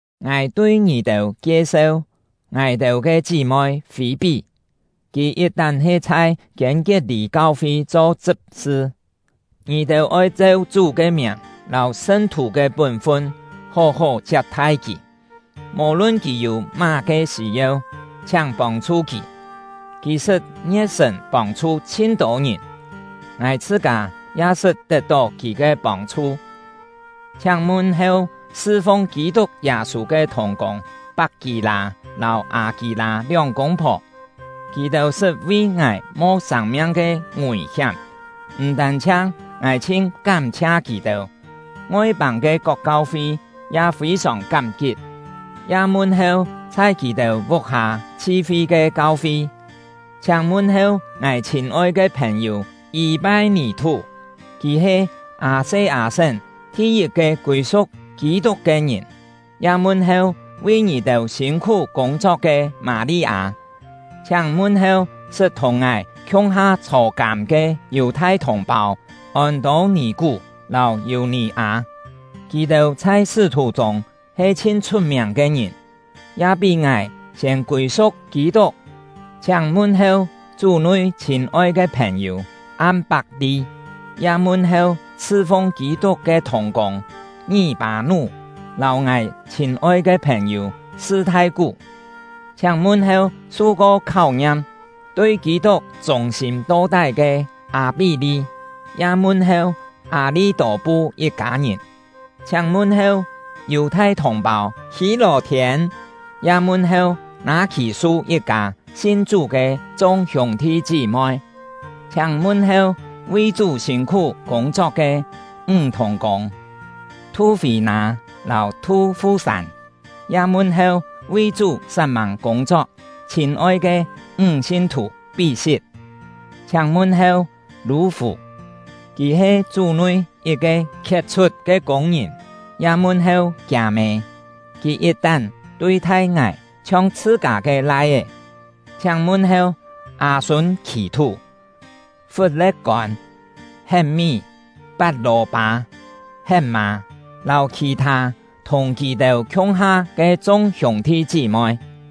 Ngài tui ngì-têu kie-seu ngài-têu ke chí-moi Fî-pí; kì yit-tán he chhai Kiên-kiet-lî kau-fi cho chṳp-sṳ. Ngì-têu oi cheu Chú ke miàng lâu sṳn-thù ke pún-fun hó-hó chiap-thai kì; mò-lun kì yû má-ke sî-yeu, chhiáng pông-chhu kì. Kì sṳt ngie̍t-sṳ̀n pông-chhu chhin-tô ngìn, ngài chhṳ-kâ ya sṳt tet-tó kì ke pông-chhu. Chhiáng mun-heu sṳ-fung Kî-tuk Yâ-sû ke thùng-kûng Pak-kî-lâ lâu Â-kî-lâ lióng kûng-phò; kì-têu sṳt vi ngài mo sâng-miang ke ngùi-hiám; m̀ tân-chhiang ngài chhin kám-chhia kì-têu, Ngoi-pâng ke kok kau-fi ya fî-sòng kám-kit. Ya mun-heu chhai kì-têu vuk-hâ chhi-fi ke kau-fi. Chhiáng mun-heu ngài chhîn-oi ke phèn-yû Yî-pai-nì-thú; kì he Â-se-â-sén thi-yit-ke kûi-su̍k Kî-tuk ke ngìn. Ya mun-heu vi ngì-têu sîn-khú kûng-chok ke Mâ-li-â. Chhiáng mun-heu sṳt thùng ngài khiung-ha chhô-kâm ke Yù-thai thùng-pâu Ôn-tô-nì-kú lâu Yù-nì-â; kì-têu chhai sṳ́-thù chûng he chhin chhut-miàng ke ngìn, ya pí ngài siên kûi-su̍k Kî-tuk. Chhiáng mun-heu Chú-nui chhîn-oi ke phèn-yû Am-pak-li; ya mun-heu sṳ-fung Kî-tuk ke thùng-kûng Ngí-pâ-nú lâu ngài chhîn-oi ke phèn-yû Sṳ-thai-kú. Chhiáng mun-heu su-ko kháu-ngiam, tui Kî-tuk chûng-sîm to-tái ke Â-pí-li; ya mun-heu Â-li-tô-pu yit-kâ ngìn. Chhiáng mun-heu Yù-thai thùng-pâu Hî-lò-thiên; ya mun-heu Nâ-khì-su yit-kâ sin Chú ke chung hiûng-thi chí-moi. Chhiáng mun-heu vi Chú sîn-khú kûng-chok ke ńg thùng-kûng Thu-fî-nâ lâu Thu-fu-sân; ya mun-heu vi Chú sat-mâng kûng-chok chhîn-oi ke ńg sin-thù Pí-sit. Chhiáng mun-heu Lû-fù; kì he Chú-nui yit-ke khiet-chhut ke kûng-ngìn; ya mun-heu kiâ-mê, kì yit-tán tui-thai ngài chhiong chhṳ-kâ ke lai-é. Chhiáng mun-heu Â-sun-khì-thú, Fut-le̍t-kôn, Het-mí, Pat-lò-pâ, Het-mâ, lâu khì-thâ thùng kì-têu khiung-ha ke chung hiûng-thi chí-moi.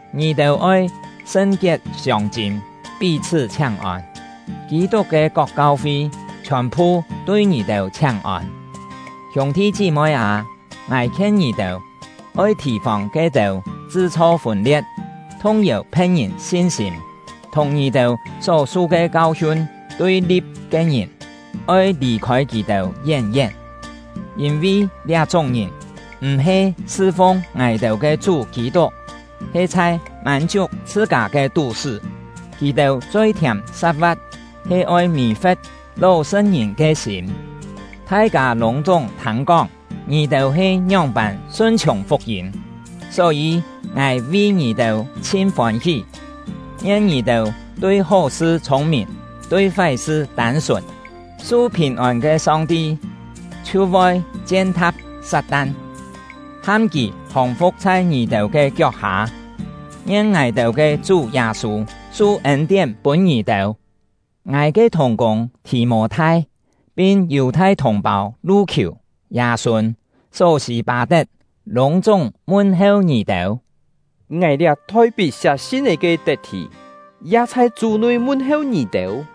Ngì-têu oi sṳn-kiet siông-chîm pí-chhṳ́ chhiáng-ôn. Kî-tuk ke kok kau-fi chhiòn-phu tui ngì-têu chhiáng-ôn. Hiûng-thi chí-moi â, ngài khien ngì-têu, oi thì-fòng ke-têu chṳ-chho fûn-lie̍t, thung-yèu phe̍t-ngìn sin-sîm, thùng ngì-têu só su ke kau-hiun tui-li̍p ke ngìn; oi lì-khôi kì-têu yén-yén. Yîn-vi liá-chúng ngìn m̀-he sṳ-fung ngài-têu ke Chú Kî-tuk, he chhai mân-chiuk chhṳ-kâ ke tú-sṳ́. Kì-têu choi-thiàm sa̍t-va̍t he oi mì-fe̍t ló-sṳ̍t-ngìn ke sîm. Thai-kâ lûng-chúng thâng-kóng ngì-têu he ngióng-pân sun-chhiùng fuk-yîm; só-yî ngài vi ngì-têu chhin fôn-hí! Ngien ngì-têu tui hó-sṳ chhûng-mìn, tui fái-sṳ tân-sùn. Su phìn-ôn ke Song-ti chhiu voi chien-tha̍p Sat-tan, ham kì hòng-fu̍k chhai ngì-têu ke kiok-hâ. Ngien ngài-têu ke Chú Yâ-sû su ên-tién pûn ngì-têu! Ngài ke thùng-kûng Thì-mô-thai, pin Yù-thai thùng-pâu Lu-khiù, Yâ-sûn, Só-sî-pâ-tet, lûng-chúng mun-heu ngì-têu. Ngài — liá thoi-pit siá sin-é ke Tet-thì, ya chhai Chú-nui mun-heu ngì-têu.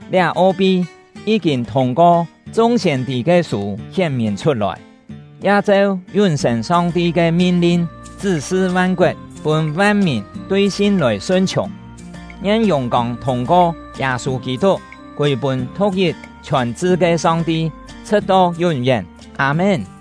Liá o-pi yí-kîn thûng-ko chung siên-tî ke sû hién-mìn chhut-lòi, ya cheu yún-sên Song-ti ke min-lin chṳ́-sṳ van-koet, pûn van-mìn tui sin lòi sun-chhiùng. Ngien yùng-kông thûng-ko Yâ-sû Kî-tuk kûi-pûn thu̍k-yit chhiòn-chṳ ke Song-ti, chhṳ̍t-to yún-yén! Â-mén.